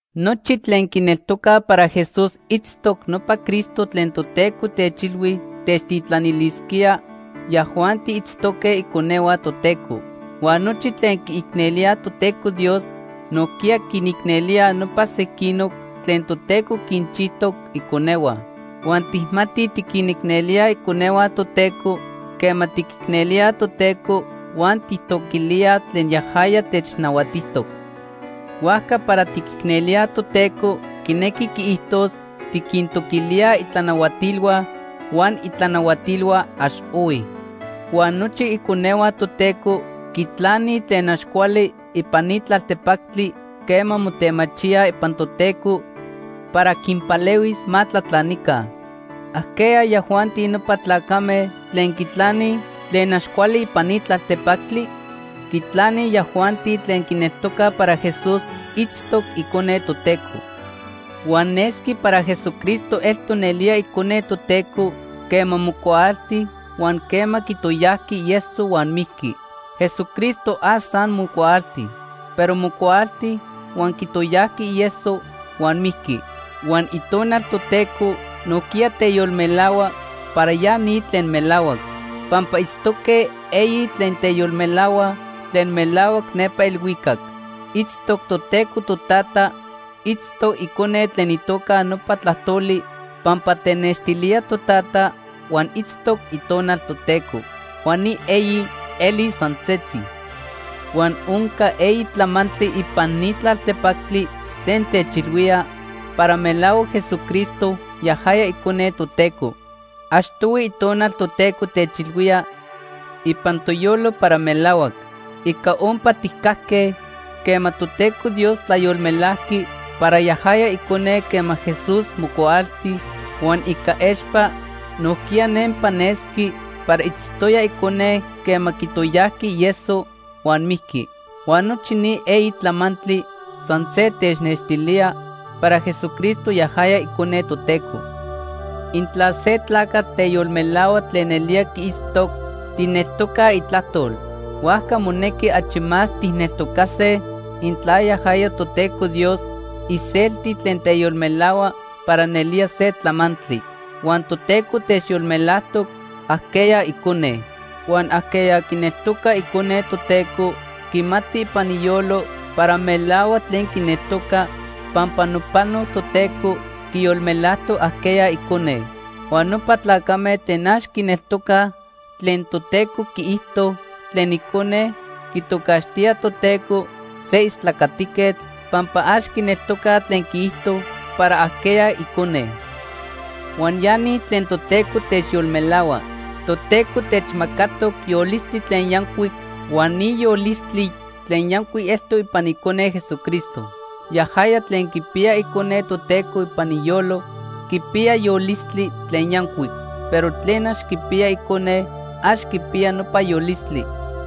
Nochi tlen quineltocaj para Jesús itztoc nopa Cristo tlen Toteco techilhui techtitlanilisquía, yajuanti itztoque iconehua Toteco. Huan nochi tlen quiicnelíaj Toteco Dios, nojquiya quinicnelíaj nopa sequinoc tlen Toteco quinchijtoc iconehua. Huan tijmatij tiquinicnelíaj iconehua Toteco quema tiquicnelíaj Toteco huan tijtoquilíaj tlen yajaya technahuatijtoc. Huajca para tiquicnelíaj Toteco quinequi quiijtos tiquintoquilíaj itlanahuatilhua, huan itlanahuatilhua ax ohui. Huan nochi iconehua Toteco quitlanij tlen ax cuali ipan ni tlaltepactli quema motemachíaj ipan Toteco para quinpalehuis ma tlatlanica. ¿Ajqueya yajuanti nopa tlacame tlen quitlanij tlen ax cuali ipan ni tlaltepactli? Quitlanij yajuanti tlen quineltocaj para Jesús itztoc Icone Toteco. Huan nesqui para Jesucristo eltoc nelía Icone Toteco quema mocuaalti huan quema quitoyajqui ieso huan mijqui. Jesucristo ax san mocuaalti, pero mocuaalti, huan quitoyajqui ieso huan mijqui. Huan Itonal Toteco nojquiya teyolmelahua para ya ni tlen melahuac. Pampa itztoque eyi tlen teyolmelahuaj tlen melahuac nepa elhuicac. Itztoc Toteco Totata, itztoc Icone tlen itoca nopa “Tlajtoli” pampa tenextilía Totata, huan itztoc Itonal Toteco. Huan ni eyi elij san setzi. Huan onca eyi tlamantli ipan ni tlaltepactli tlen techilhuía para melahuac Jesucristo yajaya icone Toteco. Achtohui Itonal Toteco techilhuía ipan toyolo para melahuac. Ica ompa tijcajque quema Toteco Dios tlayolmelajqui para yajaya Icone quema Jesús mocuaalti, huan ica expa nojquiya nempa nesqui para itztoya Icone quema quitoyajqui ieso huan mijqui. Huan nochi ni eyi tlamantli san se technextilía para Jesucristo yajaya Icone Toteco. Intla se tlacatl teyolmelahua tlen nelía quiitztoc, tijneltocaj itlajtol. Huajca monequi achi más tijneltocase intla yajaya Toteco Dios iselti tlen teyolmelahua para nelía se tlamantli. Huan Toteco techyolmelajtoc ajqueya Icone. Huan ajqueya quineltoca Icone Toteco quimati ipan iyolo para melahuac tlen quineltoca pampa nopano Toteco quiyolmelajtoc ajqueya icone. Huan nopa tlacame tlen ax quineltocaj tlen Toteco quiijto tlen Icone, quitocaxtíaj Toteco se istlacatiquetl, pampa ax quineltocaj tlen quiijto para ajqueya Icone. Huan ya ni tlen Toteco techyolmelahua: Toteco techmacatoc yolistli tlen yancuic huan ni yolistli tlen yancuic eltoc ipan Icone Jesucristo. Yajaya tlen quipiya Icone Toteco ipan iyolo quipiya yolistli tlen yancuic, pero tlen ax quipiya Icone, ax quipiya nopa yolistli.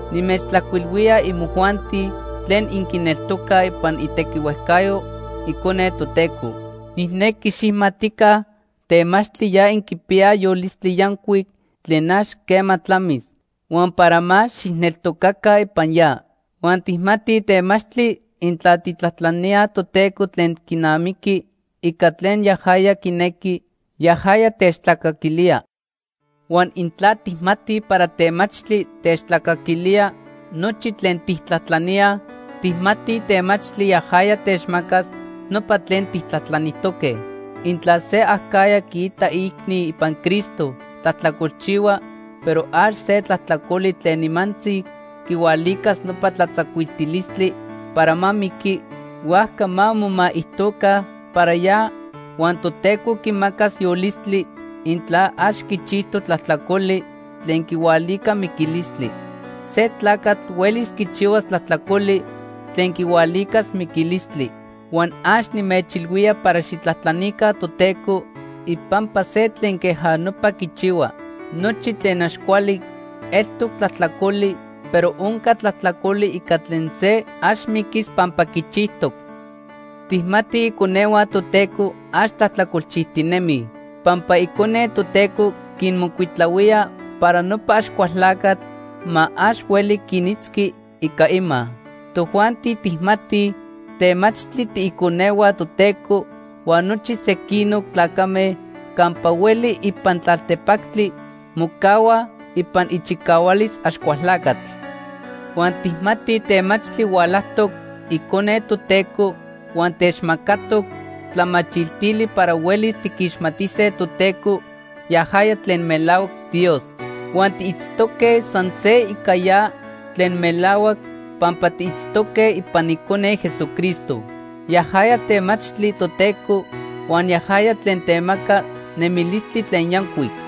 Nimechtlajcuilhuilía imojuanti tlen inquineltocaj ipan itequihuejcayo Icone Toteco. Nijnequi xijmatica temachtli ya inquipiyaj yolistli yancuic tlen ax quema tlamis, huan para más xijneltocaca ipan ya. Huan tijmatij temachtli intla tijtlajtlaníaj Toteco tlen quinamiqui ica tlen yajaya quinequi, yajaya techtlacaquilía. Huan intla tijmatij para temachtli techtlacaquilía nochi tlen tijtlajtlaníaj, tijmatij temachtli yajaya techmacas nopa tlen tijtlajtlanijtoque. Intla se acajya quiita iicni ipan Cristo tlajtlacolchihua, pero ax se tlajtlacoli tlen nimantzi quihualicas nopa tlatzacuiltilistli para ma miqui, huajca ma momaijtoca para ya huan Toteco quimacas yolistli, intla ax quichijtoc tlajtlacoli tlen quihualica miquilistli. Se tlacatl huelis quichihuas tlajtlacoli tlen quihualicas miquilistli, huan ax nimechilhuía para xijtlajtlanica Toteco ipampa se tlen queja nopa quichihua. Nochi tlen ax cuali, eltoc tlajtlacoli, pero onca tlajtlacoli ica tlen se ax miquis pampa quichijtoc. Tijmatij iconehua Toteco ax tlajtlacolchijtinemij pampa Icone Toteco quinmocuitahuía para nopa Axcualtlacatl ma ax hueli quinitzqui ica ima. Tojuanti tijmatij temachtli tiiconehua Toteco huan nochi sequinoc tlacame campa hueli ipan tlaltepactli mocahuaj ipan ichicahualis Axcualtlacatl. Huan tijmatij temachtli hualajtoc Icone Toteco huan techmacatoc tlamachiltili para huelis tiquixmatise Toteco, yajaya tlen melahuac Dios. Huan tiitztoque san se ica ya tlen melahuac, pampa tiitztoque ipan Icone, Jesucristo. Yajaya temachtli Toteco huan yajaya tlen temaca nemilistli tlen yancuic.